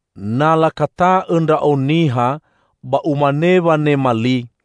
Na lakata'õ ndra'o niha, ba umane wanema li: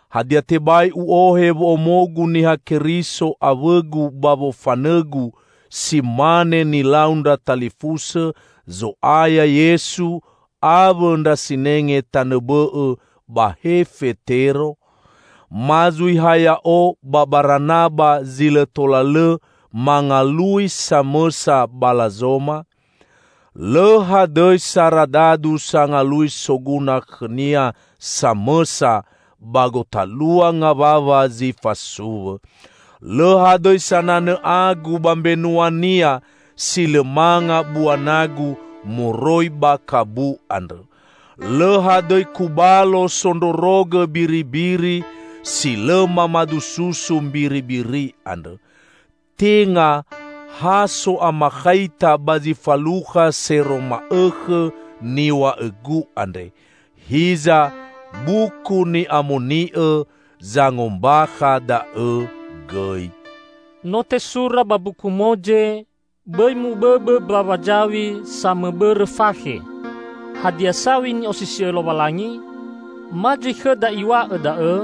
Hadia tebai u'ohe wo'omogu Niha Keriso awõgu ba wofanõgu, si mane nilau ndra talifusõ Zo'aya Yesu, awõ ndra sinenge tanõ bõ'õ, ba he Fetero? Ma zui ha ya'o ba Baranaba zi lõ tola lõ mangalui samõsa balazoma? Lõ hadõi saradadu sangalui soguna khõnia samõsa ba gotalua ngawawa zi fasuwõ! Lõ hadõi sananõ agu ba mbenuania si lõ manga bua nagu moroi ba kabu andrõ! Lõ hadõi kubalo sondrorogõ biribiri, si lõ mamadu susu mbiribiri andrõ. Tenga ha so'amakhaita ba zi falukha sero ma'õkhõ niw̃a'õgu andre, hiza Buku Ni'amoni'õ zangombakha da'õ gõi. No tesura ba Mbuku Moze, "Bõi mubõbõ mbawa zaw̃i samõbõrõ fakhe." Hadia, saw̃i ni'osisi'õ Lowalangi? Ma zui khõda Iw̃a'õ da'õ?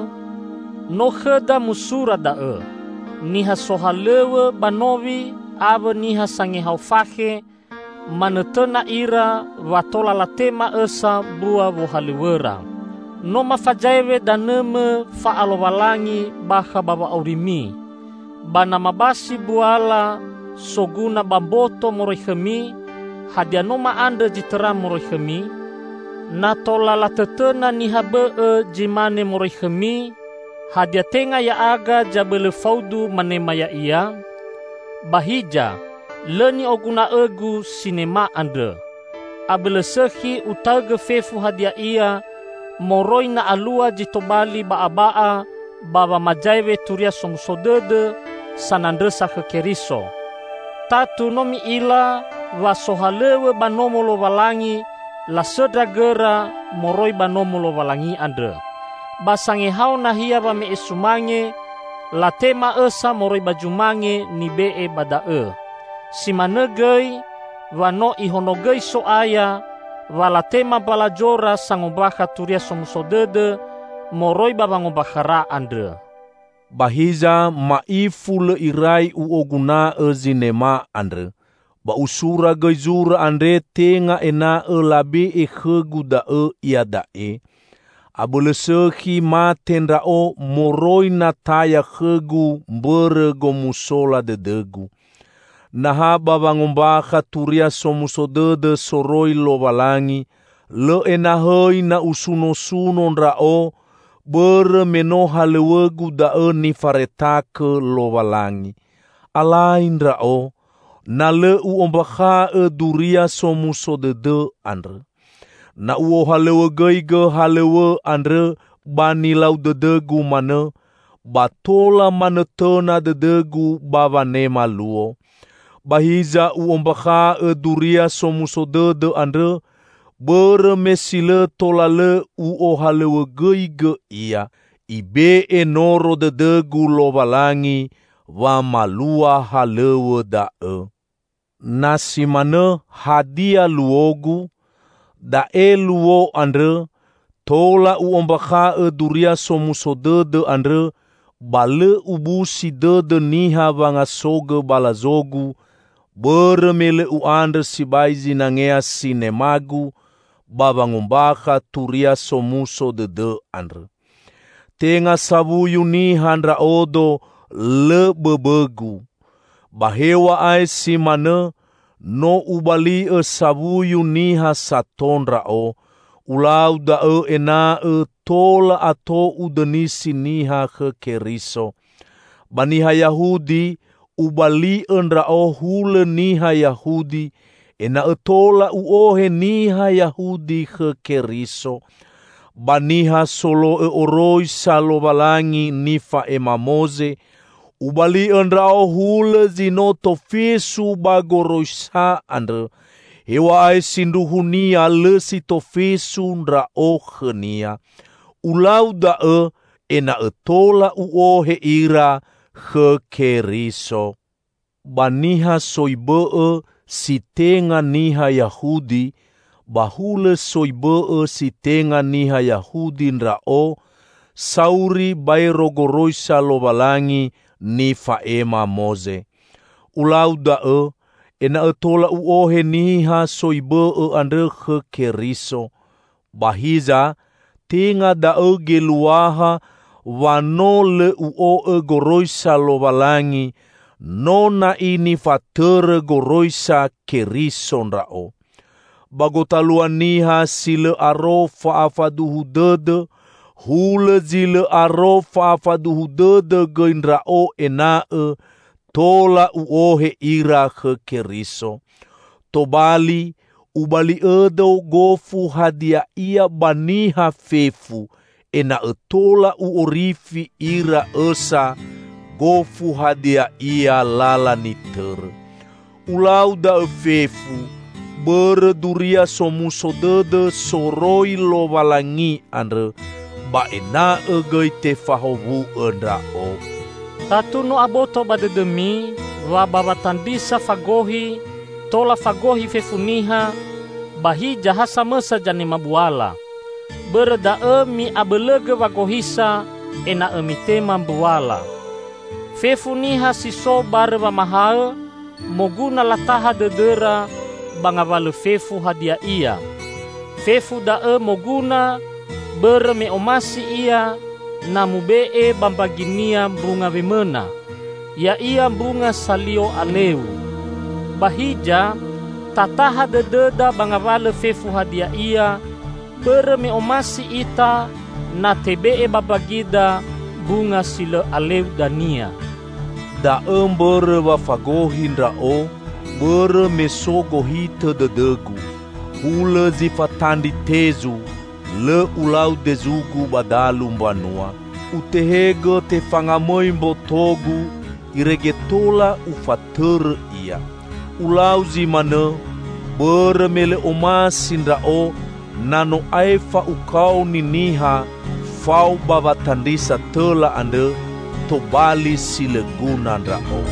No khõda musura da'õ. Niha sohalõw̃õ ba nowi awõ niha sangehao fakhe, manõtõna ira wa tola latema õsa mbua wohalõw̃õra. No mafazaewe danõmõ fa'alowalangi bakha ba wa'aurimi. Ba na mabasi mbuala soguna ba mboto moroi khõmi, hadia no ma'andrõ zi tõra moroi khõmi? Na tola latõtõna niha bõ'õ zi mane moroi khõmi, hadia tenga ya'aga zabõlõ faudu manema ya'ia? Ba hiza lõ ni'oguna'õgu sinema andrõ. Abõlõ sõkhi utaõgõ fefu hadia ia moroi na alua zi tobali ba'aba'a ba wamazaewe Turia Somuso Dõdõ sanandrõsa khõ Keriso. Tatu no mi'ila wa sohalõw̃õ ba Nomo Lowalangi lasõndra gõra moroi ba Nomo Lowalangi andrõ. Ba sangehao nahia wame'e sumange, latema õsa moroi ba zumange nibe'e ba da'õ. Si manõ gõi wa no Ihonogõi So'aya wa latema mbalazora sangombakha Turia Somuso Dõdõ moroi ba wangombakhara andrõ. Ba hiza ma'ifu lõ irai u'oguna'õ zinema andrõ. Ba usura gõi zura andre tenga ena'õ labe'e khõgu da'õ iada'e. Abõlõ sõkhi mate ndra'o moroi na taya khõgu mbõrõ gomusola dõdõgu. Na ha ba wangombakha Turia Somuso Dõdõ soroi Lowalangi, lõ enahõi na usunosuno ndra'o, bõrõ me no halõw̃õgu da'õ nifaretakõ Lowalangi. Alai ndra'o, na lõ u'ombakha'õ Duria Somuso Dõdõ andrõ! Na u'ohalõwõgõigõ halõw̃õ andrõ ba nilau dõdõgu manõ, ba tola manõtõna dõdõgu ba wanema luo. Ba hiza u'ombakha'õ Duria Somuso Dõdõ andrõ bõrõ me si lõ tola lõ u'ohalõwõgõigõ ia. Ibe'e noro dõdõgu Lowalangi wamalua halõw̃õ da'õ. Na si manõ, hadia luogu? Da'e luo andrõ: Tola u'ombakha'õ Duria Somuso Dõdõ andrõ ba lõ ubusi dõdõ niha wangasogõ balazogu, bõrõ me lõ u'andrõ sibai zinangea sinemagu ba wangombakha Turia Somuso Dõdõ andrõ. Tenga sawuyu niha ndra'odo, lõ bõbõgu. Ba hew̃a'ae si manõ, no ubali'õ sawuyu niha sato ndra'o. Ulau da'õ ena'õ tola ato udõnisi niha khõ Keriso. Ba niha Yahudi, ubali'õ ndra'o hulõ niha Yahudi, ena'õ tola u'ohe niha Yahudi khõ Keriso. Ba niha solo'õ oroisa Lowalangi nifa'ema Moze, ubali'õ ndra'o hulõ zi no tofesu ba goroisa andrõ, hew̃a'ae sindruhunia lõ si tofesu ndra'o khõnia. Ulau da'õ ena'õ tola u'ohe ira khõ Keriso. Ba niha soi bõ'õ si tenga niha Yahudi, ba hulõ soi bõ'õ si tenga niha Yahudi ndra'o, sauri baero goroisa Lowalangi nifa'ema Moze. Ulau da'õ ena'õ tola u'ohe niha soi bõ'õ andrõ khõ Keriso. Ba hiza, tenga da'õ geluaha wa no lõ u'o'õ goroisa Lowalangi; no na'i nifatõrõ goroisa Keriso ndra'o. Ba gotalua niha si lõ aro fa'afaduhu dõdõ, hulõ zi lõ aro fa'afaduhu dõdõ gõi ndra'o ena'õ tola u'ohe ira khõ Keriso. Tobali, ubali'õdo gofu hadia ia ba niha fefu, ena'õ tola u'orifi ira õsa, gofu hadia ia lala nitõrõ. Ulau da'õ fefu bõrõ Duria Somuso Dõdõ soroi Lowalangi andrõ, ba ena'õ gõi tefahowu'õ ndra'o. Tatu no aboto ba dõdõmi, wa ba watandrisa fagohi, tola fagohi fefu niha, ba hiza ha samõsa zanema buala. Bõrõ da'õ mi'abõlõgõ wagohisa ena'õ mitema mbuala. Fefu niha si so barõ wamahaõ, moguna lataha dõdõra ba ngawalõ fefu hadia ia. Fefu da'õ moguna bõrõ me omasi ia na mube'e ba mbaginia mbunga wemõna, ya'ia mbunga salio aleu. Ba hiza, tataha dõdõda ba ngawalõ fefu hadia ia bõrõ me omasi ita na tebe'e ba mbagida mbunga si lõ aleu dania. Da'õ mbõrõ wa fagohi ndra'o bõrõ me so gohitõ dõdõgu. Hulõ zi fatandri tezu, lõ ulau dezugu ba dalu mbanua. Utehegõ tefangamõi mbotogu irege tola ufatõrõ ia. Ulau zi manõ bõrõ me lõ omasi ndra'o na no aefa ukaoni niha fao ba watandrisa tõla andrõ, tobali si lõ guna ndra'o.